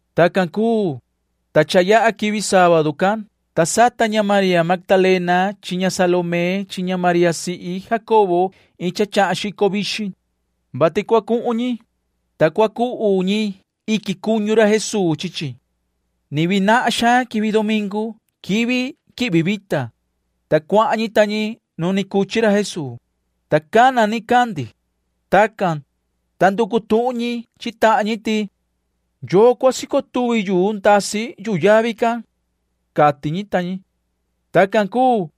Tacan cuu, ta cha yaha quivi sábadu can, ta sata ña María Magdalena chi ña Salomé chi ña María sihi Jacobo iin cha chahan xico vixin, vati cua cuhun ñi, ta cua cuhu ñi iquin cuñu ra Jesuu chi chi. Ni vii nahan xaan quivi domingu [quivi quihvi vita], ta cuahan ñi ta ñi nu ni cuchi ra Jesuu, ta cana nicandi. Tacan, ta nducu tuhun ñi chi tahan ñi ti: ―¿Yoo cua sico tuvi yuu ndasi yuhu yavi can? ―cati ñi ta ñi. Tacan cuu,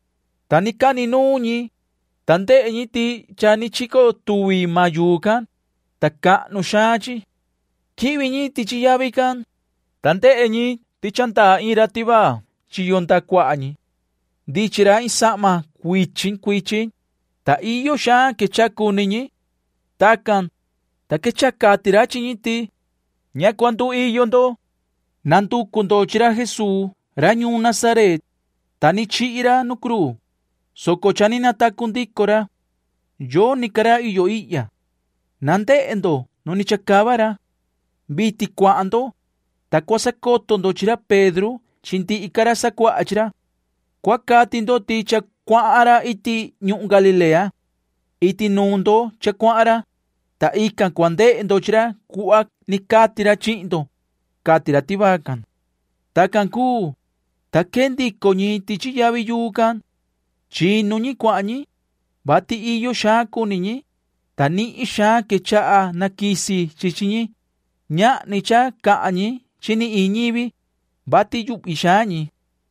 ta ni cani nuun ñi, ta ndehe ñi ti cha ni chico tuvi maan yuu can, ta cahnu xaan chi. Quihvi ñi tichi yavi can, ta ndehe ñi ti cha ndaa iin ra tivaa chiyo ndaha cuaha ñi. Ndichin ra iin sahma cuichin cuichin, ta iyo xaan quechaha cuni ñi. Tacan, ta quechaha cati ra chi ñi ti: ―Ña cua cuiyo ndo. Nducu ndo chi ra Jesuu ra ñuun Nazaret, ta ni chihi ra nu cruu, soco cha ni natacu ndico ra. Yoni ca ra iyo ihya. Na ndehe ndo nu ni chacava ra. Vitin cuahan ndo, ta cua sacoto ndo chi ra Pedro chi ndihi ca ra sacuaha chi ra. Cua cati ndo ti cha cuahan ra iti ñuhun Galilea. Iti nuun ndo cha cuahan ra, ta ican cua ndehe ndo chi ra cuhva ni cati ra chihin ndo ―cati ra tivaa can. Tacan cuu, ta quee ndico ñi tichi yavi yuu can. Chinu ñi cuahan ñi, vati iyo xaan cuni ñi, ta nihin xaan quechaha naquisi chi chi ñi. Ñahni cha cahan ñi ni chi iin ñivi, vati yuhvi xaan ñi.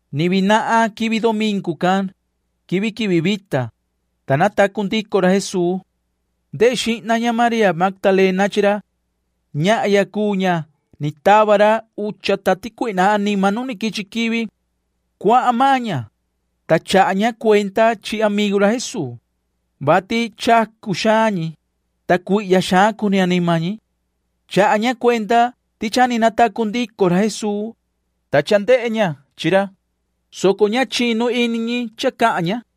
Ni vii nahan quivi domingu can [quivi quihvi vita], ta natacu ndico ra Jesuu. Ndehe xihna ña María Magdalena chi ra. Ñahya cuu ña cha ni tava ra ucha tati cuihna anima nu quichi quivi. Cuahan maan ña, ta chaha ña cuenda chi amigu ra Jesuu, vati chacu xaan ñi, ta cuihya xaan cuni anima ñi. Chaha ña cuenda ti cha ni natacu ndico ra Jesuu, ta cha ndehe ña chi ra, soco ña chinu ini ñi cha cahan ña.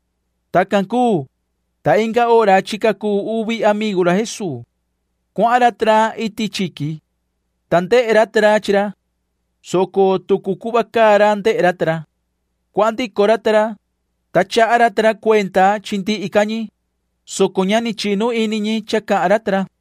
Tacan cuu, ta inga hora chica cuu uvi amigu ra Jesuu. Cuahan ra ta ra iti chiqui, ta ndehe ra ta ra chi ra, soco tucu cuhva caa ra ndehe ra ta ra. Cuahan ndico ra ta ra, ta chaha ra ta ra cuenda chi ndihi ca ñi, soco ña ni chinu ini ñi cha cahan ra ta ra.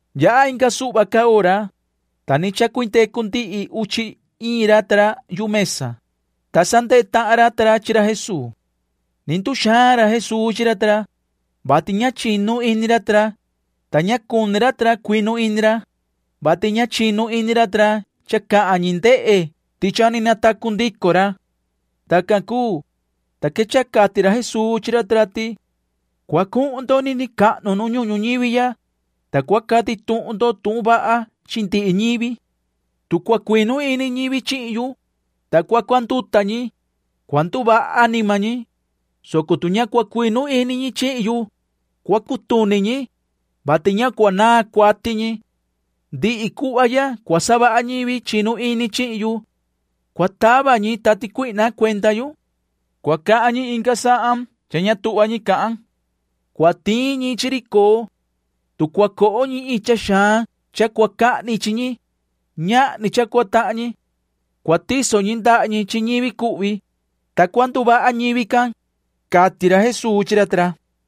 Yaha inga suhva ca hora, ta ni chacuindecu ndihi uchi iin ra ta ra yu mesa, ta sa ndehe tahan ra ta ra chi ra Jesuu. Ni nduxaan ra Jesuu chi ra ta ra, vati ña chinu ini ra ta ra, ta ña cuni ra ta ra cuinu ini ra, vati ña chinu ini ra ta ra cha cahan ñi ndehe ti cha ni natacu ndico ra. Tacan cuu, ta quechaha cati ra Jesuu chi ra ta ra ti: ―Cua cuhun ndo nini cahnu nu ñuhun ñuñivi ya, ta cua cati tuhun ndo tuhun vaha chi ndihi ñivi. Tu cua cuinu ini ñivi chihin yu, ta cua cuanduta ñi, cua nduvaha anima ñi, soco tu ña cua cuinu ini ñi chihin yu, cua cutuni ñi, [vati ña cua naan cuati ñi]. Ndihi cuhva ya cua savaha ñivi chinu ini chihin yu. Cua tava ñi tati cuihna cuenda yu. Cua cahan ñi inga sahan cha ña tuhva ñi cahan. Cua tiin ñi chi ri coo. Tu cua coho ñi iin cha xaan cha cua cahni chi ñi, ñahni cha cua tahan ñi. Cua tiso ñi ndaha ñi chi ñivi cuhvi, ta cua nduvaha ñivi can ―cati ra Jesuu chi ra ta ra.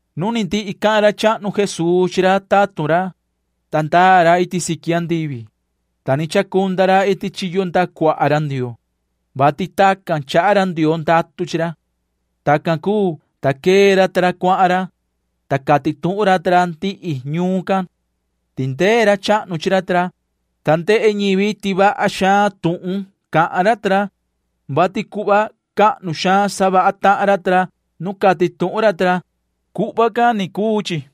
Nu ni ndihi cahan ra chahnu Jesuu chi ra tatun ra, ta ndaa ra iti siqui andivi, ta ni chacunda ra iti chiyo ndaha cuaha ra Ndioo, [vati tacan chaha ra Ndioo ndatu chi ra]. Tacan cuu, ta quee ra ta ra cuahan ra, ta cati tuhun ra ta ra ndihi ñuun can. Tindee ra chahnu chi ra ta ra, ta ndehe ñivi ti vaha xaan tuhun cahan ra ta ra, vati cuhva cahnu xaan savaha tahan ra ta ra nu cati tuhun ra ta ra. Tacan ni cha cuu chi.